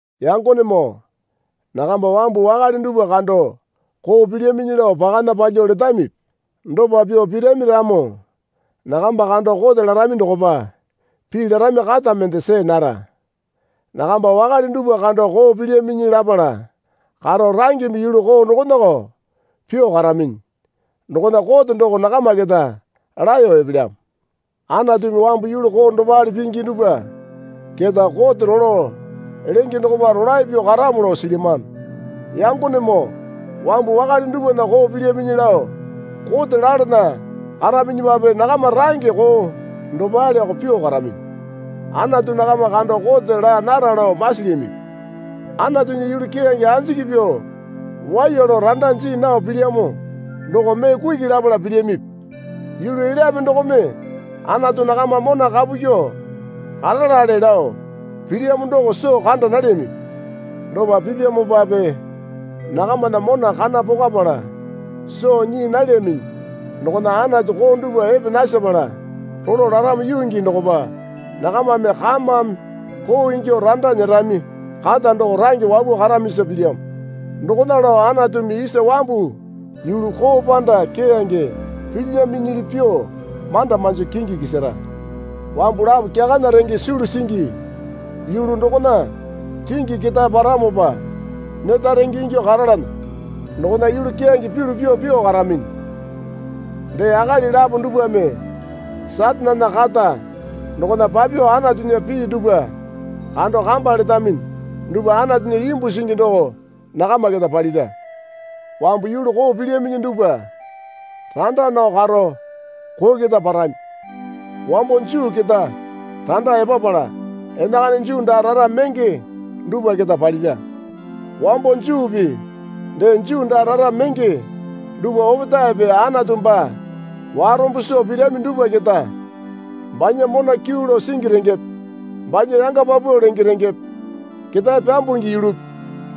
Yangonemoo nakamba wambu wakale dupwa kando koo pilyaminyi lao pakana palyuo letamipi? Dopa pyuo pirami ramo nakamba kando kote larami dokopa pii larami kata mende see nara. Nakamba wakale dupwa kando koo pilyaminyi lapala karo rangeme yulu koo dokonako pyuo karaminyi dokona kote doko nakama keta laeyo epelyamo. Anatumi wambu yulu koo dopale pingi dupwa keta kote rolo lenge dokopa rolae pyuo karamo lao silyamano. Yangonemoo wambu wakale dupwana koo pilyaminyi lao kote lalana karaminyipape nakama range koo dopaleko pyuo karaminyi. Anatu nakama kando kote laa nara lao masilyamipi? Anatunya yulu keyange anjiki pyuo waiya lao randa jii nao pilyamo doko mee kuki lapala pilyamipi? Yulu elyape dokome Anatu nakama mona kapu kyuo karalale lao pilyamo doko soo kanda nalyamipi? Dopa pipyamopape nakamana mona kana pokwapala soo nyii nalyaminyi dokona Anatu koo dupwa epe nasepala rolo laramo yuu gii dokopa nakamame kamame koo ingyuo randa nyerami kata doko range wapuo karamisa pilyamo. Dokona lao Anatumi isa wambu yulu koo panda keyange pilyaminyili pyuo manda manjo kingi kisara. Wambu lapo kyakana renge sulu singi yulu dokona kingi ketae paramopa neta renge ingyuo karalana dokona yulu keyange pyulu pyuo pyuo karaminyi. Dee akali lapo dupwame Satanena kata dokona papyuo Anatunya pii dupwa kando kamba letaminyi dupwa Anatunya imbu singi doko nakama keta palira. Wambu yulu koo pilyaminyi dupwa randa nao karo koo keta parami. Wambo Juu keta randa epapala enakana Juu daa rara menge dupwa keta palira. Wambo Juupi dee Juu daa rara menge dupwa opetaepe Anatu baa warombo soo pirami dupwa keta banya mona kyuu lao singi rengepe banya yanga paupau lenge rengepe ketae pyambungi yulupi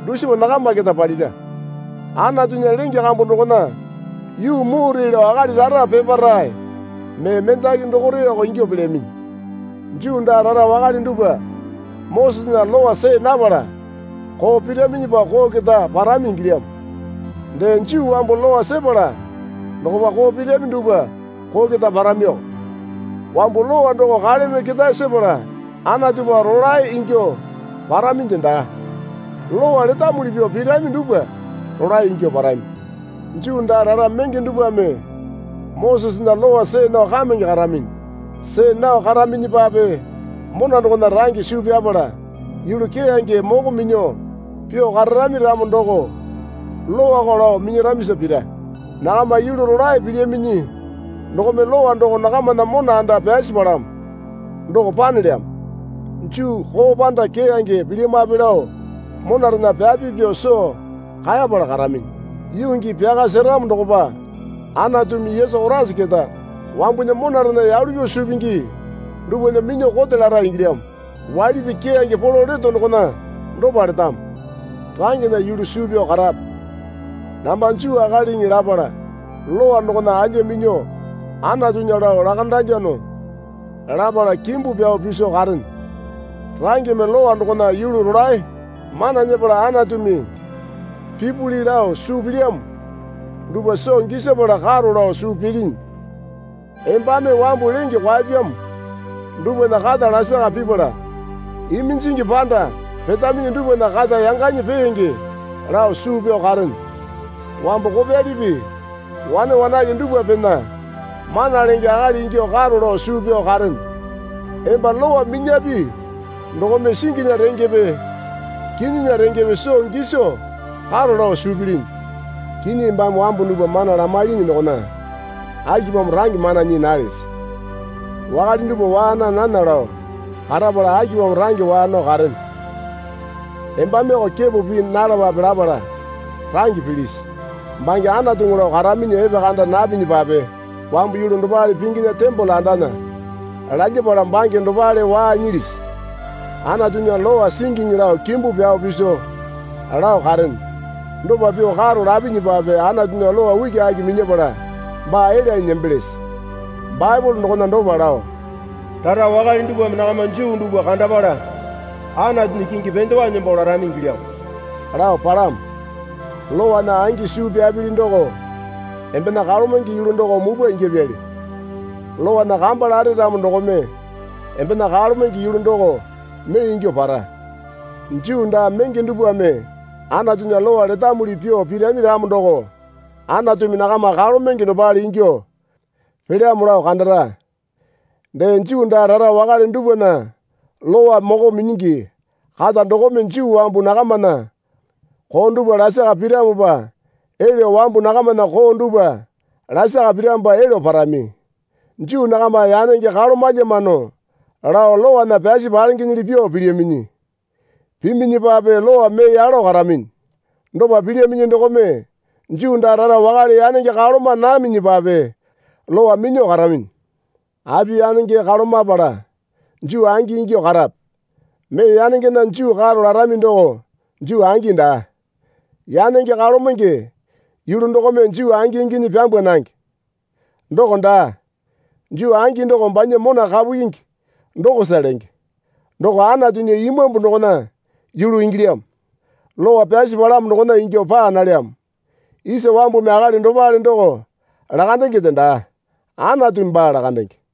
dusipa nakama keta palira. Anatunya lenge kambu dokona yuu mure lao akali rara peparae mee mendaki dokoreko ingyuo pelyaminyi. Juu daa rara wakale dupwa Mosesena Lowa see napala koo piraminyipa koo keta parami ingilyamo. Dee Juu wambu Lowa sepala dokopa koo pirami dupwa koo keta paramioko. Wambu Lowa doko kaleme ketae sepala Anatupa rolae ingyuo paraminde daa. Lowa letamuli pyuo pirami dupwa rolae ingyuo parami. Juu daa rara menge dupwame Mosesena Lowa see nao kamenge karaminyi. See nao karaminyipape mona dokona range suu pyapala yulu keyange moko minyuo pyuo kararami ramo doko Lowako lao minyaramisa pira. Nakama yulu rolae pilyaminyi dokome Lowa doko nakamana mona anda pyasi palamo doko panelyamo. Juu koo panda keyange pilyamape lao monarena pyapi pyuo soo kaeyapala karaminyi. Yuu gii pyaka seramo dokopa Anatumi Yesu Koraisa keta wambunya monarena yalu pyuo suu pingi dupwana minyuo kote lara ingilyamo. Waili pii keyange polo leto dokona dopa letamo. Rangena yulu suu pyao karape. Namba Juu akaliŋi lapala Lowa dokona alya minyuo Anatunya lao lakandalyano lapala kimbu pyao piso karene. Rangeme Lowa dokona yulu rolae mana nyepala Anatumi pipuli lao suu pilyamo dupwa soo gisapala karo lao suu pilinyi. Embame wambu lenge kwaepyamo dupwana kata lasaka pipala iminjingi panda petaminyi dupwana kata yanganyi peenge lao suu pyao karene. Wambu kopyalipi wane wanake dupwapena mana lenge akali ingyuo karo lao suu pyao karene. Emba Lowa minyapi dokome singinya rengepe kinyinya rengepe soo giso karo lao suu pilinyi. Kinyi embame wambu dupwa mana lamailinyi dokona akipamo range mana nyii nalese? Wakale dupwa waa naa nana lao karapala akipamo range waa nao karene? Embameko kepo pii nalapape lapala range pilisi? Bange Anatuŋu lao karaminyi epekanda napinyapape wambu yulu dopale pinginya tembole andana lalyapala bange dopale waa nyilisi? Anatunya lowa singiŋi lao kimbu pyao piso lao karene. Dopa pyuo karo lapinyipape Anatunya lowa ukiaki minyapala baa elyanyi nembelese? Baepole dokona dopa lao, Rara wakale dupwame nakama Juu dupwa kandapala Anatunya kingi pendewa nembo larami ingilyamoo lao palamo. Lowana angi suu pyapili doko embena kalomenge yulu doko mupwa ingyapyali. Lowana kamba lare ramo dokome embena kalomenge yulu doko mee ingyuo para. Juu daa menge dupwame Anatunya Lowa letamuli pyuo pirami ramo doko Anatumi nakama kalomenge dopale ingyuo pelyamo lao kandara. Dee Juu daa rara wakale dupwana Lowa moko minyingi kata dokome Juu wambu nakamana koo dupwa lasaka piramopa elyo wambu nakamana koo dupwa lasaka piramopa elyo parami. Juu nakama yanenge kalomalyamano lao Lowana pyasi palengenyili pyuo pilyaminyi. Piminyipape Lowa mee yalo karaminyi. Dopa pilyaminyi dokome Juu daa rara wakale yanenge kaloma naminyipape Lowa minyuo karaminyi. Api yanenge kalomapala Juu angi ingyuo karape? Mee yanengena Juu karo larami doko Juu angi daa. Yanenge kalomenge yulu dokome Juu angi inginyi pyambwa nange. Doko daa. Juu angi doko banya mona kapu kyingi dokosa lenge. Doko Anatunya Imambu dokona yulu ingilyamo. Lowa pyasi palamo dokona ingyuo paa nalyamo. Isa wambumi akali dopale doko lakandengende daa. Anatumi baa lakandenge.